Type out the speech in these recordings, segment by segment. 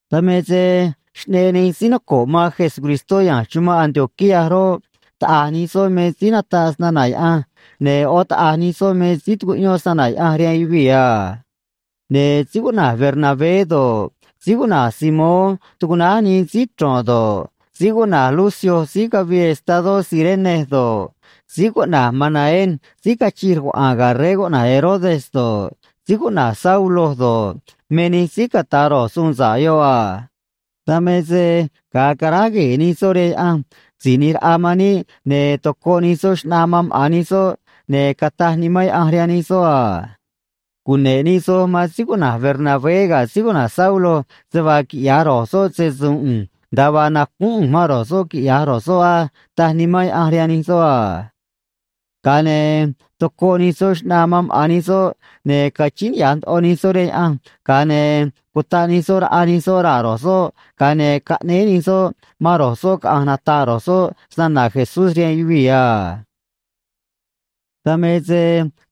Dan me se xꞌneꞌ nij síí noco̱ꞌ man Jesucristó ya̱nj chumanꞌ Antioquía roꞌ, taꞌa̱j nij soꞌ me síí nataꞌ snana̱ Yaꞌanj, ne̱ ꞌó taꞌa̱j nij soꞌ me síí tucuꞌyón snana̱ Yaꞌanj rihaan yuvii̱ a. Ne̱ síí cuꞌna̱j Bernabé do̱ꞌ, síí cuꞌna̱j Simón tucuꞌnáj nii Síí Chro̱n do̱ꞌ, síí cuꞌna̱j Lucio síí cavii estadó Cirene do̱ꞌ, síí cuꞌna̱j Manaén síí cachij rcuaꞌa̱a̱n ga̱ rey cuꞌna̱j Herodes do̱ꞌ, síí cuꞌna̱j Saulo do̱ꞌ, me nij síí cata̱ ro̱j suun sa̱ꞌ yoꞌ a. Dan me se ga̱a caráj gue̱e̱ nij soꞌ rihaan Yaꞌanj Si̱j ꞌNi̱j Raꞌa man níꞌ, ne̱ tocoꞌ nij soꞌ xꞌnaa man maꞌa̱n nij soꞌ, ne̱ cataj Nimán Yaꞌanj rihaan nij soꞌ a: ―Cune̱ꞌ nij soj man síí cuꞌna̱j Bernabé ga̱ síí cuꞌna̱j Saulo se vaa quiꞌya̱j ro̱j soꞌ se‑su̱u̱n ꞌu̱nj nda̱a vaa nacúún ꞌu̱nj man ro̱j soꞌ quiꞌya̱j ro̱j soꞌ á ―taj Nimán Yaꞌanj rihaan nij soꞌ a. Ga̱a ne̱ tocoꞌ nij soꞌ xꞌnaa man maꞌa̱n nij soꞌ, ne̱ cachíín niꞌya̱j ndoꞌo nij soꞌ rihaan Yaꞌanj, ga̱a ne̱ cutaꞌ nij soꞌ raꞌa nij soꞌ raa̱ ro̱j soꞌ, ga̱a ne̱ caꞌnéé nij soꞌ man ro̱j soꞌ caꞌa̱nj nata̱ꞌ ro̱j soꞌ snana̱ Jesús rihaan yuvii̱ a. Dan me se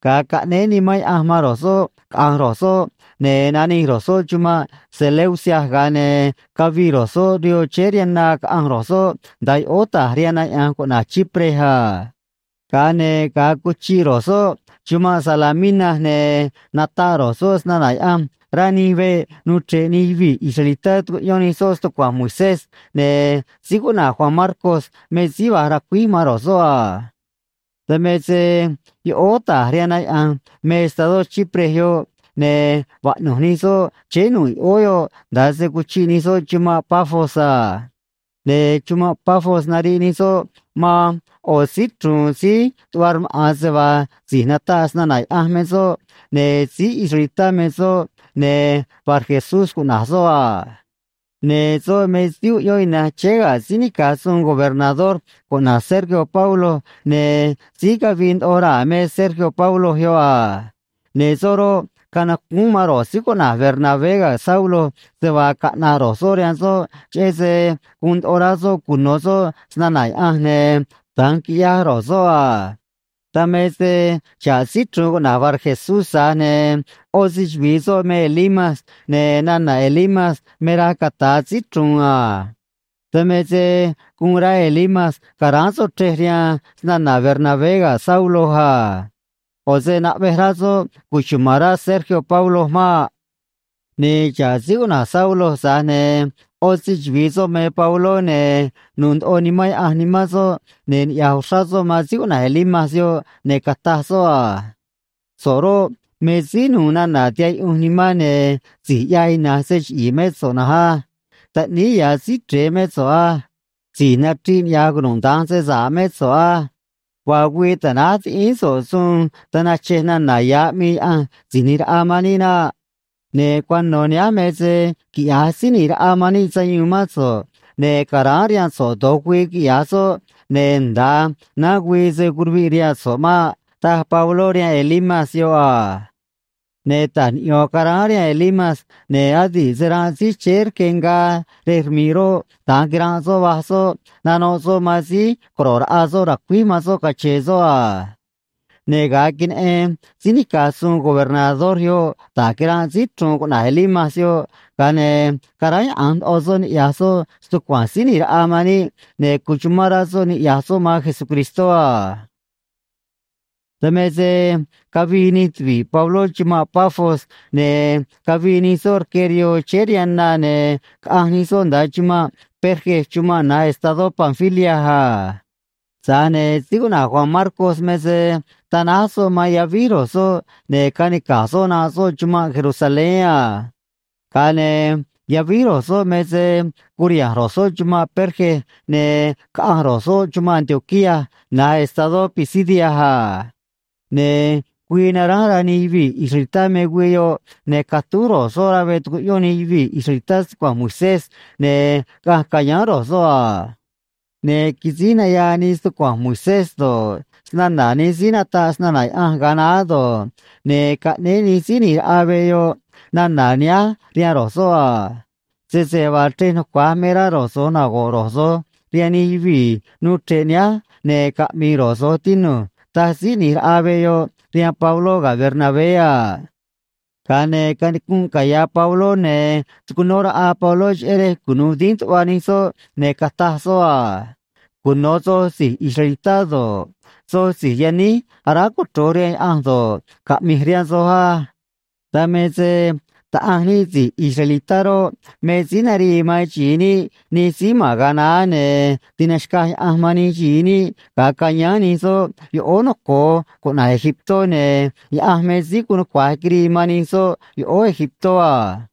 ga̱a caꞌnéé Nimán Yaꞌanj man ro̱j soꞌ caꞌa̱nj ro̱j soꞌ, ne̱ nanij ro̱j soꞌ chumanꞌ Seleucia, ga̱a ne̱ cavii ro̱j soꞌ rihoo chéé rihaan na caꞌanj ro̱j soꞌ nda̱a yoꞌóó ta̱j rihaan na yaꞌa̱nj cuꞌna̱j Chipre a. Ga̱a ne̱ ga̱a cuchiꞌ ro̱j soꞌ chumanꞌ Salamina, ne̱ nataꞌ ro̱j soꞌ snana̱ Yaꞌanj rá nij veꞌ nuu chre̱ꞌ nij yuvii̱ israelitá tu̱cuꞌyón nij soꞌ stucua̱nj Moisés, ne̱ síí cuꞌna̱j Juan Marcos me síí va̱j ra̱cuíj man ro̱j soꞌ a. Dan me se yoꞌóó ta̱j rihaan na yaꞌa̱nj me estadó Chipre yoꞌ, ne̱ vaꞌnu̱j nij soꞌ chéé nu̱ꞌ yoꞌóó yoꞌ nda̱a se cuchiꞌ nij soꞌ chumanꞌ Pafos a. Ne̱ chumanꞌ Pafos nariꞌ nij soꞌ man ꞌo̱ síí chru̱u̱n síí tuꞌva rmaꞌa̱n se vaa si̱j nataꞌ snana̱ Yaꞌanj me soꞌ, ne̱ síí israelitá me soꞌ, ne̱ Barjesús cuꞌna̱j soꞌ a. Ne̱ soꞌ me síí uꞌyón ina̱nj chéé ga̱ síí nica̱j suun gobernador cuꞌna̱j Sergio Paulo, ne̱ síí cavii ndoꞌo raa̱ me Sergio Paulo yoꞌ a. Ne̱ soꞌ roꞌ, canacúún man ro̱j síí cuꞌna̱j Bernabé ga̱ Saulo se vaa caꞌna̱ꞌ ro̱j soꞌ rihaan soꞌ, cheꞌé se guun ndoꞌo rá soꞌ cuno̱ soꞌ snana̱ Yaꞌanj, ne̱ da̱nj quiꞌyaj ro̱j soꞌ a. Dan me se xa̱ꞌ síí chru̱u̱n cuꞌna̱j Barjesús, tza̱j ne̱ ꞌó se‑chuvi̱i soꞌ me Elimas, ne̱ nana̱ Elimas me raj cata̱a “síí chru̱u̱n” a. Dan me se guun rá Elimas ca̱ráán soꞌ chrej rihaan snana̱ Bernabé ga̱ Saulo a. ꞌO̱ se naꞌvej rá soꞌ cuchuma̱n rá Sergio Paulo maꞌ. Ne̱ xa̱ꞌ síí cuꞌna̱j Saulo, tza̱j ne̱ ꞌó se‑chuvi̱i soꞌ me Pabló, ne̱ nu̱u̱ ndoꞌo Nimán Yaꞌanj nimán soꞌ, ne̱ niꞌya̱j uxrá soꞌ man síí cuꞌna̱j Elimas yoꞌ, ne̱ cataj soꞌ a: ―So̱ꞌ roꞌ, me síí nu̱u̱ nana̱ tihaꞌ yuꞌunj nimán, ne̱ si̱j ꞌyaj ina̱nj se chiꞌi̱i̱ mé so̱ꞌ na̱nj á. Taꞌníí ya̱ Síí Chre̱e mé so̱ꞌ á. Si̱j nachriꞌ niꞌya̱j cunuda̱nj se sa̱ꞌ mé so̱ꞌ á. Vaa güii ta̱náj tiꞌíín so̱ꞌ suun tanachej nana̱ ya̱ aꞌmii Yaꞌanj Si̱j ꞌNi̱j Raꞌa man níꞌ naꞌ. Ne̱ cuano̱ nihánj me se quiꞌya̱j Síí ꞌNi̱j Raꞌa man níꞌ sayuun mán so̱ꞌ, ne̱ ca̱ráán rihaan so̱ꞌ do̱j güii, quiꞌya̱j soꞌ, ne̱ nda̱a naán güii se̱ curuviꞌ rihaan so̱ꞌ maꞌ ―taj Pabló rihaan Elimas yoꞌ a. Ne̱ ta̱j niꞌyo̱n caráán rihaan Elimas, ne̱ adi̱ꞌ se ranꞌ síí chéé rque ngaa rej rmi̱ꞌ roꞌ, da̱nj quiranꞌ soꞌ, va̱j soꞌ, nanoꞌ soꞌ man síí co̱ro̱ꞌ raꞌa soꞌ ra̱cuíj man soꞌ cache̱e̱ soꞌ a. Ne̱ ga̱a queneꞌen síí nica̱j suun gobernador yoꞌ da̱j quiranꞌ síí chru̱u̱n cuꞌna̱j Elimas yoꞌ, ga̱a ne̱ caráyaꞌa̱nj ndoꞌo soꞌ niꞌya̱j soꞌ stucua̱nj Síí ꞌNi̱j Raꞌa man níꞌ, ne̱ cuchumán rá soꞌ niꞌya̱j soꞌ man Jesucristó a. Dan me se cavii nij tuvi̱ꞌ Pabló chumanꞌ Pafos, ne̱ cavii nij soꞌ rque rihoo chéé rihaan na, ne̱ caꞌanj nij soꞌ nda̱a chumanꞌ Perge chumanꞌ na̱j estadó Panfilia a. Tza̱j ne̱ síí cuꞌna̱j Juan Marcos me se tanáj soꞌ man yavíj ro̱j soꞌ, ne̱ canica̱j soꞌ nanꞌ soꞌ chumanꞌ Jerusalén a. Ga̱a ne̱ yavíj ro̱j soꞌ me se curiha̱nj ro̱j soꞌ chumanꞌ Perge, ne̱ caꞌanj ro̱j soꞌ chumanꞌ Antioquía na̱j estadó Pisidia a. Ne̱ güii naránj rá nij yuvii̱ israelitá me güii yoꞌ, ne̱ catúj ro̱j soꞌ rá veꞌ tucuꞌyón nij yuvii̱ israelitá stucua̱nj Moisés, ne̱ caꞌanj ca̱yáán ro̱j soꞌ a. Ne̱ quisíj nayaa nii stucua̱nj Moisés do̱ꞌ, snana̱ nij síí nataꞌ snana̱ Yaꞌanj ga̱a naá do̱ꞌ, ne̱ caꞌnéé nij síí ꞌni̱j raꞌa veꞌ yoꞌ nana̱ nihánj rihaan ro̱j soꞌ a: ―Sese vaa chrej nucua̱j me rá ro̱j so̱j nago̱ꞌ ro̱j so̱j rihaan nij yuvii̱ nuu chre̱ꞌ nihánj, ne̱ caꞌmi̱i̱ ro̱j so̱j, tinu̱j ―taj síí ꞌni̱j raꞌa veꞌ yoꞌ rihaan Pabló ga̱ Bernabé a. Ga̱a ne̱ canicunꞌ caya̱ Pabló, ne̱ tucunó raꞌa Pabló cheꞌé rej cunu̱u dínj tuꞌva nij soꞌ, ne̱ cataj soꞌ a: ―Cuno̱ soj si̱j israelitá do̱ꞌ, soj si̱j yaníj aráj cochro̱j rihaan Yaꞌanj do̱ꞌ, caꞌmi̱j rihaan soj á. Dan me se Taꞌanj níꞌ si̱j israelitá roꞌ, me síí narii man xi̱i níꞌ nij síí ma̱n ga̱a naá, ne̱ tinaxca̱j Yaꞌanj man nij xi̱i níꞌ ga̱a cayáán nij soꞌ yoꞌóó noco̱o cuꞌna̱j Egiptó, ne̱ Yaꞌanj me síí guun nucua̱j quirii man nij soꞌ yoꞌóó Egiptó a.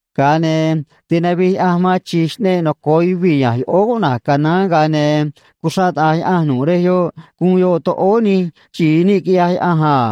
Ga̱a ne̱ tinavij Yaꞌanj man chi̱j xꞌneꞌ noco̱o yuvii̱ ya̱nj yoꞌóó cuꞌna̱j Canaán, ga̱a ne̱ cuxraꞌ taꞌa̱j Yaꞌanj nu̱ꞌ rej yoꞌ gu̱un yoꞌ toꞌóó nij xi̱i níꞌ, quiꞌyaj Yaꞌanj a.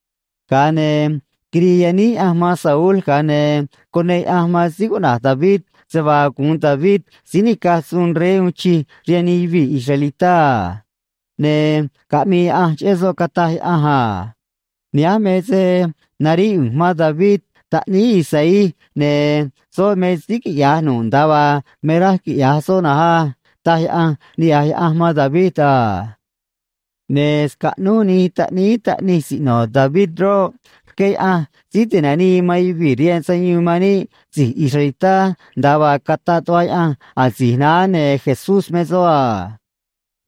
Ga̱a ne̱ quirii yaníj Yaꞌanj man Saúl, ga̱a ne̱ cuneꞌ Yaꞌanj man síí cuꞌna̱j David se vaa gu̱un David síí nica̱j suun rey uun chij rihaan nij yuvii̱ israelitá a. Ne̱ caꞌmii Yaꞌanj cheꞌé soꞌ, cataj Yaꞌanj a: “Nihánj me se naríꞌ ꞌu̱nj man David taꞌníí Isaí, ne̱ soꞌ me síí quiꞌya̱j nu̱ꞌ nda̱a vaa me raj quiꞌya̱j soꞌ na̱nj á”, taj Yaꞌanj niꞌya̱j Yaꞌanj man David a. ’Ne̱ scaꞌnúj nij taꞌníí taꞌnij siꞌno̱ David roꞌ, rqué Yaꞌanj Síí Tinanii man Yuvii̱ rihaan Sayuun man níꞌ si̱j israelitá, nda̱a vaa cataꞌ tuꞌva Yaꞌanj asi̱j naá, ne̱ Jesús me soꞌ a.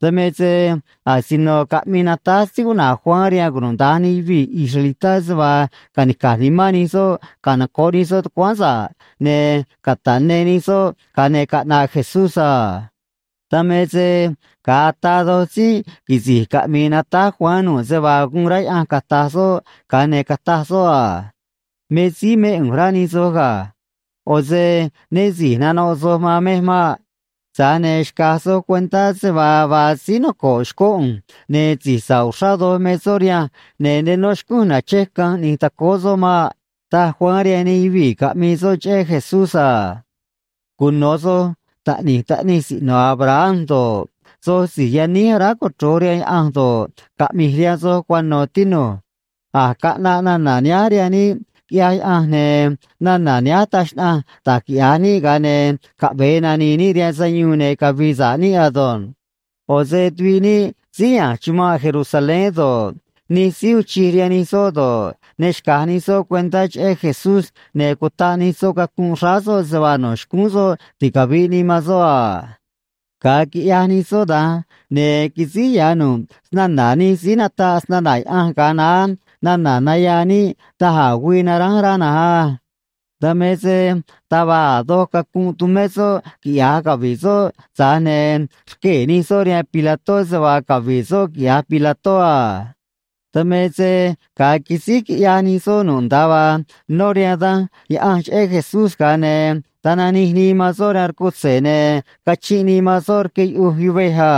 Dan me se asino caꞌmii natáj síí cuꞌna̱j Juan rihaan cunuda̱nj nij yuvii̱ israelitá se vaa ca̱nica̱j nimán nij soꞌ canoco̱ꞌ nij soꞌ tucuáán sa̱ꞌ, ne̱ cata̱ꞌ ne nij soꞌ, ga̱a ne̱ caꞌnaꞌ Jesús a. Dan me se ga̱a ataa do̱j tzínꞌ quisi̱j caꞌmii natáj Juan nu̱ꞌ se vaa guun rá Yaꞌanj cata̱j soꞌ, ga̱a ne̱ cataj soꞌ a: “Me síí mé ꞌu̱nj, rá nij soj ga̱. ꞌO̱ se né si̱j nanoꞌ soj man mej maꞌ. Tza̱j ne̱ xca̱j soj cuentá se vaa vaa síí noco̱ꞌ xcó ꞌu̱nj, ne̱ si̱j sa̱ꞌ uxrá doj me soꞌ rihanj, ne̱ ne nó xcúnj nache̱j canj ꞌni̱j tacóó soꞌ maꞌ”, taj Juan rihaan nij yuvii̱ caꞌmii soꞌ cheꞌé Jesús a. ’Cuno̱ soj taꞌni̱j taꞌnij siꞌno̱ Abraham do̱ꞌ, soj si̱j yaníj aráj cochro̱j rihaan Yaꞌanj do̱ꞌ, caꞌmi̱j rihaan soj cuano̱, tinu̱j. A̱j caꞌnaꞌ nana̱ nihánj rihaan níꞌ, quiꞌyaj Yaꞌanj, ne̱ nana̱ nihánj taj xnaꞌanj da̱j quiꞌya̱j níꞌ ga̱a ne̱ caꞌve̱e nani̱i̱ níꞌ rihaan sayuun ne̱ cavi̱i̱ sa̱ꞌ níꞌ ado̱nj. ꞌO̱ se tuviꞌ níꞌ síí ya̱nj chumanꞌ Jerusalén do̱ꞌ, nij síí uun chij rihaan nij soꞌ do̱ꞌ, ne xca̱j nij soꞌ cuentá cheꞌé Jesús, ne̱ cutaꞌ nij soꞌ cacunꞌ xráá soꞌ se vaa no̱ xcúún soꞌ ticavi̱ꞌ nii man soꞌ a. Ga̱a quiꞌyaj nij soꞌ da̱nj, ne̱ quisíj ya̱ nu̱ꞌ snana̱ nij síí nataꞌ snana̱ Yaꞌanj ga̱a naá nana̱ nayaa níꞌ da̱j a̱ güii naránj rá na̱nj á. Dan me se taj va̱j a̱ doj cacunꞌ tumé soꞌ quiꞌya̱j cavi̱ꞌ soꞌ, tza̱j ne̱ rquee̱ nij soꞌ rihaan Pilató se vaa cavi̱ꞌ soꞌ quiꞌya̱j Pilató a. Dan me se ga̱a quisíj quiꞌyaj nij soꞌ nu̱ꞌ nda̱a vaa nó rihaan Danj Yaꞌanj cheꞌé Jesús, ga̱a ne̱ tananij nii man soꞌ rihaan rcutze̱, ne̱ cachinꞌ nii man soꞌ rque yuꞌuj yuvej a.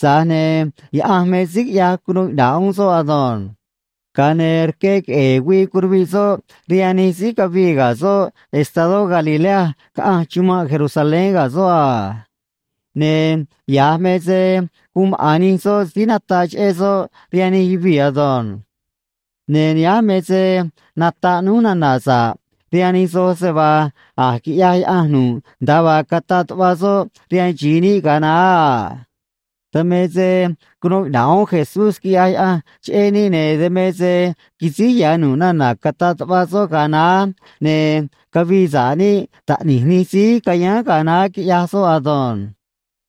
Tza̱j ne̱ Yaꞌanj me síí quiꞌyaj cunuu iꞌna̱ꞌ uún soꞌ ado̱nj. Ga̱a ne̱ rque queꞌe̱e̱ güii curuviꞌ soꞌ rihaan nij síí cavii ga̱ soꞌ estadó Galilea caꞌanj chumanꞌ Jerusalén ga̱ soꞌ a. Ne̱ ya̱j me se guun maꞌa̱n nij soꞌ síí nataꞌ cheꞌé soꞌ rihaan nij yuvii̱ ado̱nj. ’Ne̱ nihánj me se nataꞌ núj nana̱ sa̱ꞌ rihaan nij soj se vaa a̱j quiꞌyaj Yaꞌanj nu̱ꞌ nda̱a vaa cataꞌ tuꞌva soꞌ rihaan xi̱i níꞌ ga̱a naá a. Dan me se cunuu iꞌna̱ꞌ uún Jesús, quiꞌyaj Yaꞌanj cheꞌé níꞌ, ne̱ dan me se quisíj ya̱ nu̱ꞌ nana̱ cataꞌ tuꞌva soꞌ ga̱a naá, ne̱ cavii sa̱ꞌ níꞌ taꞌni̱j nij síí cayáán ga̱a naá, quiꞌyaj soꞌ ado̱nj.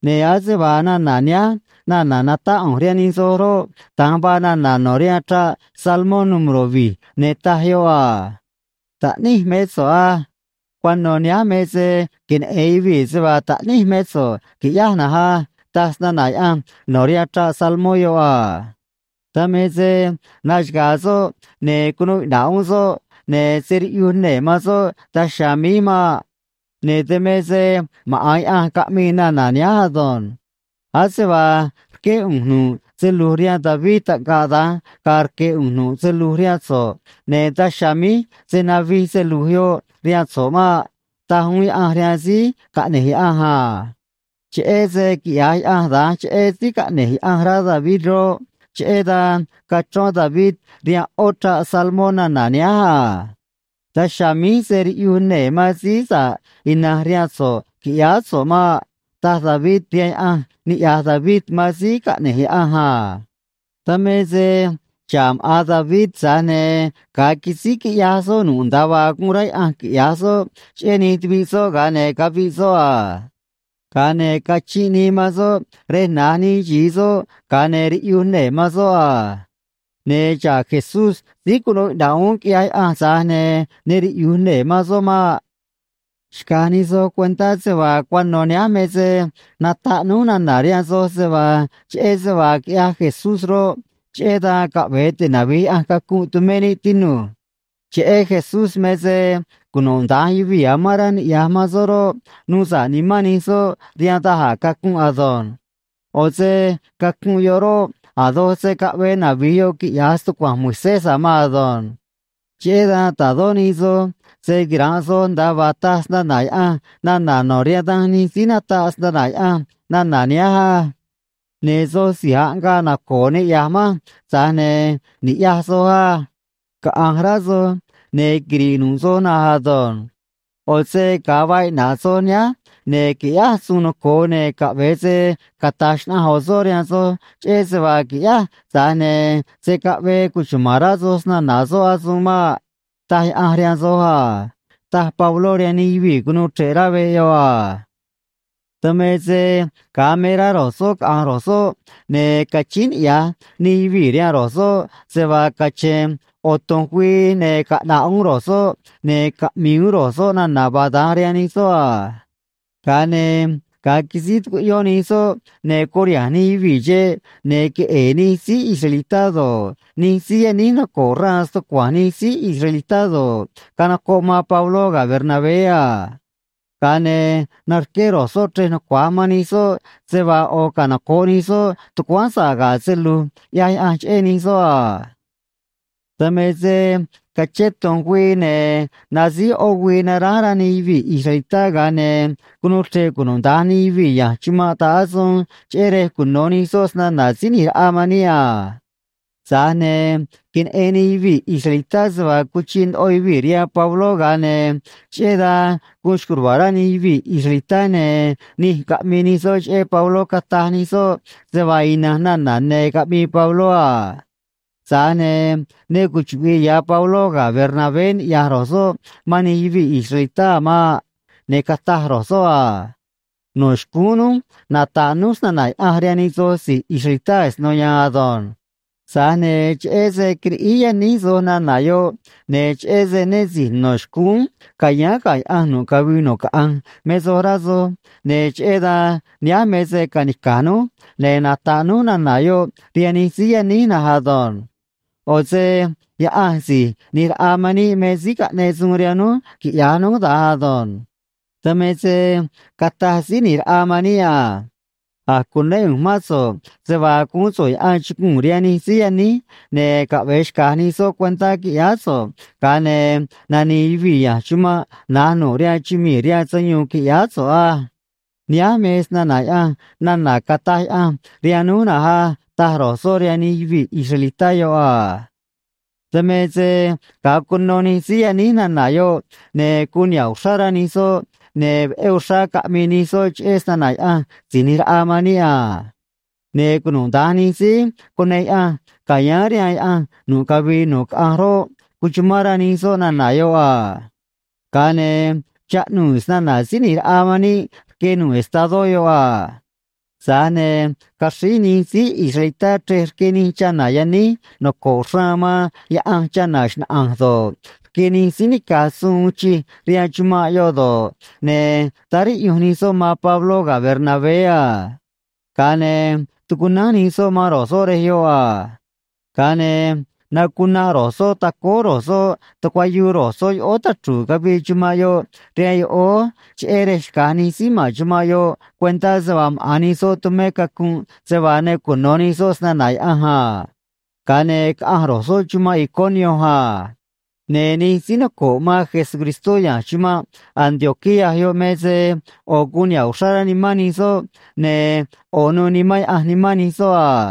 Ne̱ ase vaa nana̱ nihánj nana̱ natáꞌ ꞌu̱nj rihaan nij soj roꞌ, da̱nj vaa nana̱ no̱ rihaan Chraꞌ Salmó número̱ vi̱j, ne̱ taj yoꞌ a: “Taꞌníj mé so̱ꞌ á. Cuano̱ nihánj me se queneꞌe̱n yuvii̱ se vaa taꞌníj mé so̱ꞌ, qui̱ꞌyáj na̱nj á”, taj snana̱ Yaꞌanj no̱ rihaan Chraꞌ Salmó yoꞌ a. Dan me se naxaga̱a̱ soꞌ ne̱ cunuu iꞌna̱ꞌ uún soꞌ, ne̱ se̱ riꞌyuj nee̱ man soꞌ daj chiha̱a̱ míj maꞌ. Ne̱ dan me se maꞌa̱n Yaꞌanj caꞌmii nana̱ nihánj ado̱nj: “Ase vaa rqué ꞌu̱nj nu̱ꞌ se lu̱j rihaan David, taꞌngaꞌ da̱nj ga̱a̱ rque̱ ꞌu̱nj nu̱ꞌ se lu̱j rihaan so̱ꞌ, ne̱ daj chiha̱a̱ míj se̱ navij se lu̱j yoꞌ rihaan so̱ꞌ maꞌ”, taj uún Yaꞌanj rihaan Síí Caꞌne̱j Yaꞌanj a. Cheꞌé se quiꞌya̱j Yaꞌanj da̱nj cheꞌé Síí Caꞌne̱j Yaꞌanj rá David roꞌ, cheꞌé dan cachrón David rihaan ꞌó chraꞌ salmó nana̱ nihánj a: “Daj chiha̱a̱ míj se̱ riꞌyuj nee̱ man Síí Sa̱ꞌ Ina̱nj rihaan so̱ꞌ, qui̱ꞌyáá so̱ꞌ maꞌ”, taj David rihaan Yaꞌanj niꞌya̱j David man Síí Caꞌne̱j Yaꞌanj a. Dan me se xa̱ꞌ maꞌa̱n David, tza̱j ne̱ ga̱a quisíj quiꞌyaj soꞌ nu̱ꞌ nda̱a vaa guun rá Yaꞌanj quiꞌya̱j soꞌ cheꞌé nij tuviꞌ soꞌ, ga̱a ne̱ caviꞌ soꞌ a. Ga̱a ne̱ cachinꞌ nii man soꞌ rej na̱j nij xi̱i soꞌ, ga̱a ne̱ riꞌyuj nee̱ man soꞌ a. Ne̱ xa̱ꞌ Jesús síí cunuu iꞌna̱ꞌ uún quiꞌyaj Yaꞌanj, tza̱j ne̱ ne riꞌyu̱j nee̱ man soꞌ maꞌ. ’Xca̱j nij soj cuentá se vaa cuano̱ nihánj me se nataꞌ núj nana̱ rihaan soj se vaa cheꞌé se vaa quiꞌyaj Jesús roꞌ, cheꞌé dan caꞌve̱e tinavi̱j Yaꞌanj cacunꞌ tumé níꞌ, tinu̱j. Cheꞌé Jesús me se cunuda̱nj yuvii̱ amán rá niꞌya̱j man soꞌ roꞌ, nuu sa̱ꞌ nimán nij soꞌ rihaan da̱j a̱ cacunꞌ ado̱nj. ꞌO̱ se cacunꞌ yoꞌ roꞌ, a̱ doj se̱ caꞌvee navi̱j yoꞌ quiꞌya̱j stucua̱nj Moisés a̱ maan ado̱nj. Cheꞌé dan ta̱dó nij soj se̱ quiranꞌ soj nda̱a vaa taj snana̱ Yaꞌanj nana̱ no̱ rihaan danj nij síí nataꞌ snana̱ Yaꞌanj nana̱ nihánj á: Ne̱ soj si̱j aꞌngaꞌ naco̱o̱ niꞌya̱j manj, tza̱j ne̱ ni̱ꞌyaj soj á. Caꞌa̱nj rá soj, ne̱ quiri̱ꞌ nu̱ꞌ soj na̱nj ado̱nj. ꞌO̱ se ga̱a vaa iꞌna̱ꞌ soj nihánj, ne̱ qui̱ꞌyáj suun noco̱o, ne̱ caꞌve̱e se cata̱j xnaꞌanj ꞌo̱ soꞌ rihaan soj cheꞌé se vaa qui̱ꞌyáj, tza̱j ne̱ se̱ caꞌvee cuchuma̱n rá soj snana̱ soꞌ asuun maꞌ, taj Yaꞌanj rihaan soj a ―taj Pabló rihaan nij yuvii̱ cunuu chre̱ꞌ rá veꞌ yoꞌ a. Dan me se ga̱a me rá ro̱j soꞌ caꞌa̱nj ro̱j soꞌ, ne̱ cachíín niꞌya̱j nij yuvii̱ rihaan ro̱j soꞌ se vaa cache̱n ꞌo̱ tu̱nj güii, ne̱ caꞌna̱ꞌ uún ro̱j soꞌ ne̱ caꞌmi̱i̱ uún ro̱j soꞌ nana̱ vaa da̱nj rihaan nij soꞌ a. Ga̱a ne̱ ga̱a quisíj tucuꞌyón nij soꞌ ne̱ curiha̱nj nij yuvii̱ xeꞌ, ne̱ queꞌe̱e̱ nij síí israelitá do̱ꞌ, nij síí yaníj noco̱ꞌ xraan stucua̱nj nij síí israelitá do̱ꞌ, canocoꞌ man Pabló ga̱ Bernabé a. Ga̱a ne̱ narqué ro̱j soꞌ chrej nucua̱j man nij soꞌ se vaa ꞌo̱ canoco̱ꞌ nij soꞌ tucuáán sa̱ꞌ ga̱ se lu̱j ꞌyaj Yaꞌanj cheꞌé nij soꞌ a. Dan me se cachén tu̱nj güii ne̱ nasíj ꞌó güii naránj rá nij yuvii̱ israelitá, ga̱a ne̱ cunuu chre̱ꞌ cunuda̱nj nij yuvii̱ ya̱nj chumanꞌ ta̱ꞌ asuun, cheꞌé rej cuno̱ nij soꞌ snana̱ Síí ꞌNi̱j Raꞌa man níꞌ a. Tza̱j ne̱ queneꞌen nij yuvii̱ israelitá se vaa cuchiꞌ ndoꞌo yuvii̱ rihaan Pabló, ga̱a ne̱ cheꞌé dan guun xco̱j ruva̱a̱ rá nij yuvii̱ israelitá, ne̱ nij caꞌmii nij soꞌ cheꞌé Pabló, cataj nij soꞌ se vaa ina̱nj nana̱ ne̱ caꞌmii Pabló a. Tza̱j ne̱ ne cuchuꞌvi̱ꞌ ya̱ Pabló ga̱ Bernabé ni̱ꞌyaj ro̱j soꞌ man nij yuvii̱ israelitá a̱ maꞌ. Ne̱ cataj ro̱j soꞌ a: ―No̱ xcúún núj nata̱ꞌ núj snana̱ Yaꞌanj rihaan nij soj si̱j israelitá asino ya̱a̱n ado̱nj. Tza̱j ne̱ cheꞌé se quiriꞌíj yaníj soj nana̱ yoꞌ, ne̱ cheꞌé se né si̱j no̱ xcúún ca̱yáán ga̱ Yaꞌanj nu̱ꞌ cavii nu̱ꞌ caꞌanj me soj rá soj, ne̱ cheꞌé dan nihánj me se ca̱nica̱j núj, ne̱ nata̱ꞌ núj nana̱ yoꞌ rihaan nij síí yaníj na̱nj ado̱nj. ꞌO̱ se Yaꞌanj Si̱j ꞌNi̱j Raꞌa man níꞌ me síí caꞌneꞌ suun rihaan núj quiꞌya̱j núj da̱nj ado̱nj. Dan me se cataj Síí ꞌNi̱j Raꞌa man níꞌ a: A̱j cunéꞌ ꞌu̱nj mán so̱ꞌ se vaa guún so̱ꞌ yaꞌan chuguu̱n rihaan nij síí yaníj ne̱ caꞌve̱e xca̱j nij soꞌ cuentá, qui̱ꞌyáá so̱ꞌ, ga̱a ne̱ nani̱i̱ yuvii̱ ya̱nj chumanꞌ na̱j nu̱ꞌ rihaan chumii̱ rihaan sayuun, qui̱ꞌyáá so̱ꞌ á. Nihánj me snana̱ Yaꞌanj nana̱ cataj Yaꞌanj rihaan núj na̱nj á ―taj ro̱j soꞌ rihaan nij yuvii̱ israelitá yoꞌ a. Dan me se ga̱a cuno nij síí yaníj nana̱ yoꞌ, ne̱ guun niha̱ꞌ uxrá rá nij soꞌ, ne̱ veꞌé uxrá caꞌmii nij soꞌ cheꞌé snana̱ Yaꞌanj Si̱j ꞌNi̱j Raꞌa man níꞌ a. Ne̱ cunuda̱nj nij síí cuneꞌ Yaꞌanj ca̱yáán rihaan Yaꞌanj nu̱ꞌ cavii nu̱ꞌ caꞌanj roꞌ, cuchumán rá nij soꞌ nana̱ yoꞌ a. Ga̱a ne̱ chaꞌnuu̱ snana̱ Síí ꞌNi̱j Raꞌa man níꞌ rque nu̱ꞌ estadó yoꞌ a. Tza̱j ne̱ caxríj nij síí israelitá chrej rque nij chana̱ yaníj noco̱ꞌ xraan man Yaꞌanj chana̱ xnaꞌa̱nj do̱ꞌ, rque nij síí nica̱j suun uun chij rihaan chumanꞌ yoꞌ do̱ꞌ, ne̱ táá riꞌyunj nij soꞌ man Pabló ga̱ Bernabé a. Ga̱a ne̱ tucunánj nij soꞌ man ro̱j soꞌ rej yoꞌ a. Ga̱a ne̱ nacunanꞌ ro̱j soꞌ tacóó ro̱j soꞌ tucuayuu ro̱j soꞌ yoꞌóó tachru̱u̱ cavii chumanꞌ yoꞌ rihaan yoꞌóó, cheꞌé rej xca̱j nij síí ma̱n chumanꞌ yoꞌ cuentá se vaa maꞌa̱n nij soꞌ tumé cacunꞌ se vaa ne cuno̱ nij soꞌ snana̱ Yaꞌanj a. Ga̱a ne̱ caꞌanj ro̱j soꞌ chumanꞌ Iconio a. Ne̱ nij síí noco̱ꞌ man Jesucristó ya̱nj chumanꞌ Antioquía yoꞌ me se ꞌo̱ guun niha̱ꞌ uxrá rá nimán nij soꞌ, ne̱ ꞌo̱ nu̱u̱ Nimán Yaꞌanj nimán nij soꞌ a.